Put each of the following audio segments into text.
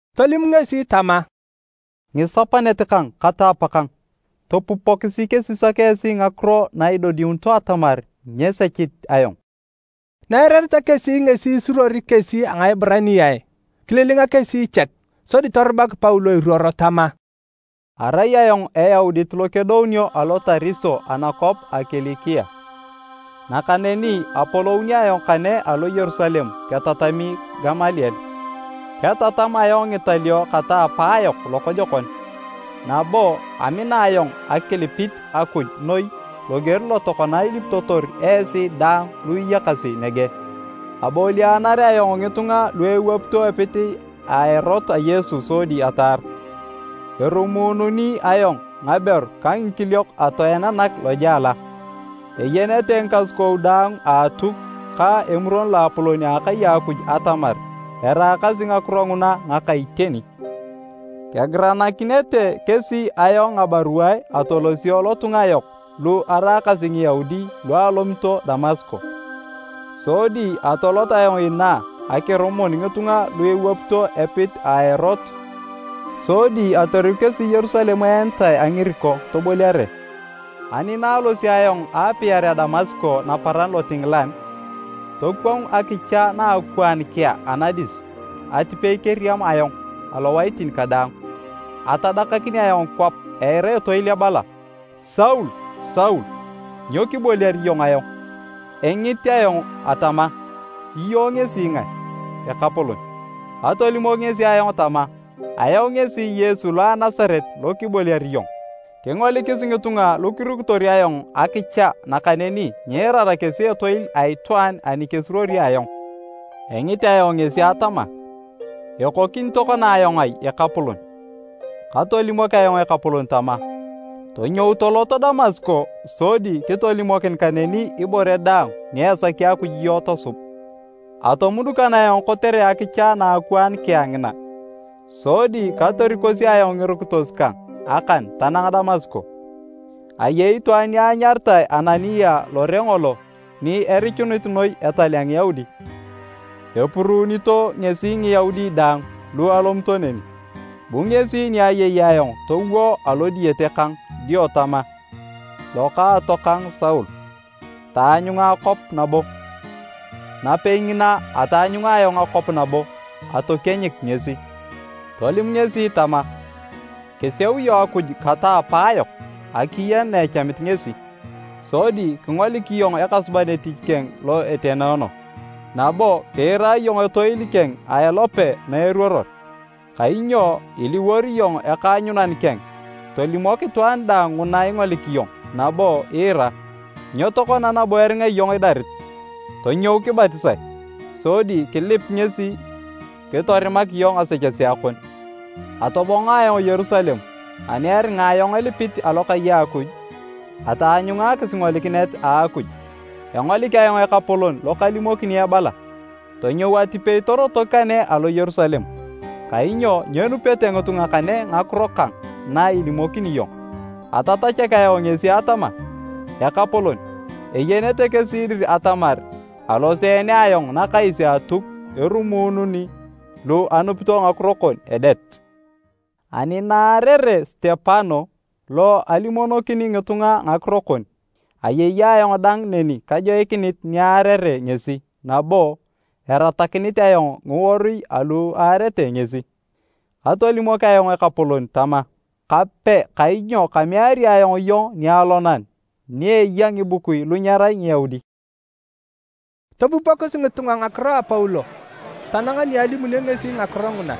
Tolim ngesi tama, “Ngisapanet kang kata apakang, topupokisi kesisak esi ngakiro na idodiunito atamar nyasechit ayong!” Na eirareta kesi ngesi isuruori kesi a Ngaeburaniae, kililinga kesi chek. Sodi torubak Paulo iruoro tama, “Arai ayong Eyaudit lo kedounio alo Tariso anakwap a Kilikia, nakaneni apolouni ayong kane alo Yerusalem ketatami Gamaliel. Ketatam ayong ngitalio kata apaayok lokojokon, nabo amina ayong akilipit Akuj noi loger lo tokona ilipitotor esi daang lu iyakasi nege. Abolianar ayong ngitunga lu ewapito epit a Erot a Yesu sodi ataar. Erumuununi ayong ngaberu ka ngikiliok atoenanak lojela. Eyenete ngikasukou daang a Atuk ka Emuron Loapolon a akai a Akuj atamar eraakasi ngakiro nguna ngaka iteni. Kegiranakinete kesi ayong ngabaruae atolosio lotunga yok lu eraakasi Ngiyaudi lu alomito Damasko. Sodi atolot ayong inaa akirumun ngitunga lu ewapito epit a Erot sodi atoriku kesi Yerusalem eenitae a ngiriko, toboliare. “Ani na alosio ayong aapiarea Damasko naparan lotingilan, tokwangu akicha na akwaan kea anadis atipei keriam ayong alowaitin kadaang. Atadakakin ayong kwap eira etoil ebala, ‘Saul, Saul! Nyo kiboliar iyong ayong?’ Engit ayong atama, ‘Iyong ngesi ngae, Ekapolon?’ Katolimok ngesi ayong tama, ‘Ayong ngesi Yesu lo a Nasaret lo kiboliar iyong.’ Kingolikis ngitunga lu kirukitor ayong akicha nakaneni nyiirara kesi etoil a itwaan ani kesuruori ayong. Engit ayong ngesi atama, ‘Ekokini tokona ayong ai Ekapolon?’ Katolimok ayong Ekapolon tama, ‘Tonyou tolot Damasko sodi kitolimokin kaneni ibore daang ni esaki Akuj iyong tosub.’ Atomudukan ayong kotere akicha na akwaan kea ngina. Sodi katorikosi ayong ngirukitos kang akan tanang Damasko. “Ayei itwaan ni anyaritae Anania lore ngolo ni erichunit noi etal a Ngiyaudi. Epuruunito ngesi Ngiyaudi daang lu alomito neni. Bu ngesi ni ayei ayong towo alo diyete kang dio tama, ‘Lokaatokang Saul, taanyunga akwap nabo!’ Napei ngina ataanyunga ayong akwap nabo atokienyik ngesi. Tolim ngesi tama, ‘Kiseu iyong Akuj kata apaayok akiyen na echamit ngesi. Sodi kingolik iyong Ekasuban etich keng lo etenoono, nabo kiira iyong etoil keng a elope na eruoror. Kainyo iliwor iyong ekaanyunan keng tolimok itwaan daang nguna ingolik iyong nabo iira. Nyo tokona nabo eringa iyong idarit? Tonyou kibatisae sodi kilip ngesi kitorimak iyong ngasechesea kon.’ “Atobongo ayong Yerusalem ani eringa ayong elipit alokai a Akuj, ataanyunga akisingolikinet a Akuj. Engolik ayong Ekapolon lo kalimokini ebala, ‘Tonyou atipei torotok kane alo Yerusalem, kainyo nyenupete ngitunga kane ngakiro kang na ilimokini iyong.’ Atatachak ayong ngesi atama, ‘Ekapolon, eyenete kesi dir atamar aloseene ayong nakais a Atuk erumuunu lu anupito ngakiro kon edet. Ani na aarere Sitepano lo alimonokini ngitunga ngakiro kon, ayei ayong dang neni kajoikinit ni aarere ngesi nabo eratakinit ayong ngiworui alu aarete ngesi.’ Katolimok ayong Ekapolon tama, ‘Kape kainyo kameari ayong iyong nialonan ni eya ngibukui lu nyerai Ngiyaudi.’” Topupokis ngitunga ngakiro a Paulo tanang na alimunio ngesi ngakiro nguna.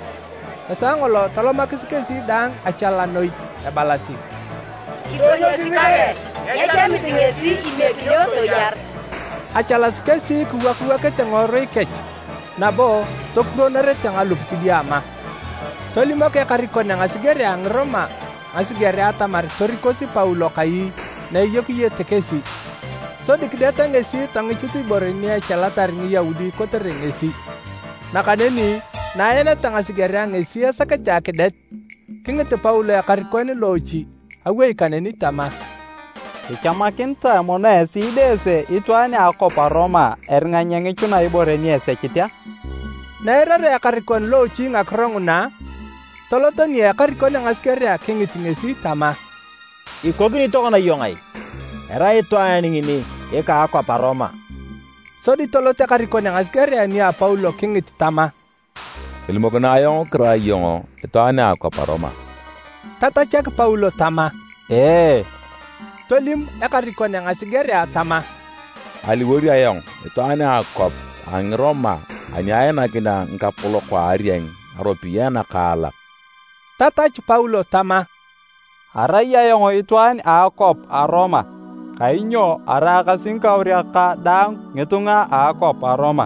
Esaa ngolo tolomakis kesi daang achala noi ebalasi, “Kidonyosi kare! Nyechamit ngesi imiekinio toyar!” Achalasi kesi kiwakiwakete ngiworui kech nabo tokurwonorete ngalup kidiama. Tolimok ekarikon a ngasigerea a Ngiroma ngasigerea atamar torikosi Paulo kai na eyokiyete kesi, sodi kideta ngesi tongichut ibore ni echalatar Ngiyaudi kotere ngesi. Nakaneni na aeneta ngasigerea ngesi esakete akidet, kingit Paulo ekarikon loochi awei kaneni tama, “Kichamakinitae mono esi ideese itwaan a akwap a Roma, eringa nyengichuna ibore ni esechit a?” Na eirarea ekarikon loochi ngakiro nguna, tolot nia ekarikon a ngasigerea kingit ngesi tama, “Ikokini tokona iyong ai? Erai itwaan ngini ika a akwap a Roma!” Sodi tolot ekarikon a ngasigerea nia Paulo kingit tama, “Tolimokinae ayong kirai iyong itwaan a akwap a Roma?” Tatachak Paulo tama, “Ee.” Tolim ekarikon a ngasigerea tama, “Aliwor ayong itwaan a akwap a Ngiroma ani ainakinea ngikapolok a arieng ngaropiyae nakaalak.” Tatachu Paulo tama, “Arai ayong itwaan a akwap a Roma kainyo araakasi ngikauriak kang dang ngitunga a akwap a Roma.”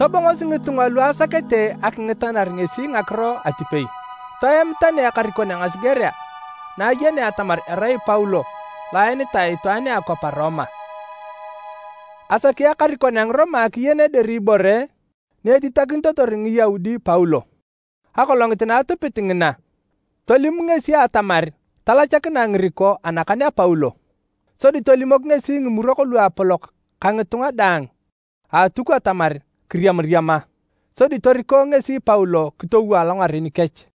Tobongosi ngitunga lu asakete akingitanar ngesi ngakiro atipei. Toem tani ekarikon a ngasigerea na ayenea atamar erai Paulo lo aenitae itwaan a akwap a Roma. Asaki ekarikon a Ngiroma akiyen dir ibore ni etitakinitotor Ngiyaudi Paulo. Akolongit na atupit ngina, tolim ngesi atamar talacharae ngiriko anakan a Paulo, sodi tolimok ngesi Ngimurok Luapolok ka ngitunga daang a Atuk atamar kiriamariama. Sodi toriko ngesi Paulo kitowo alongaren kech.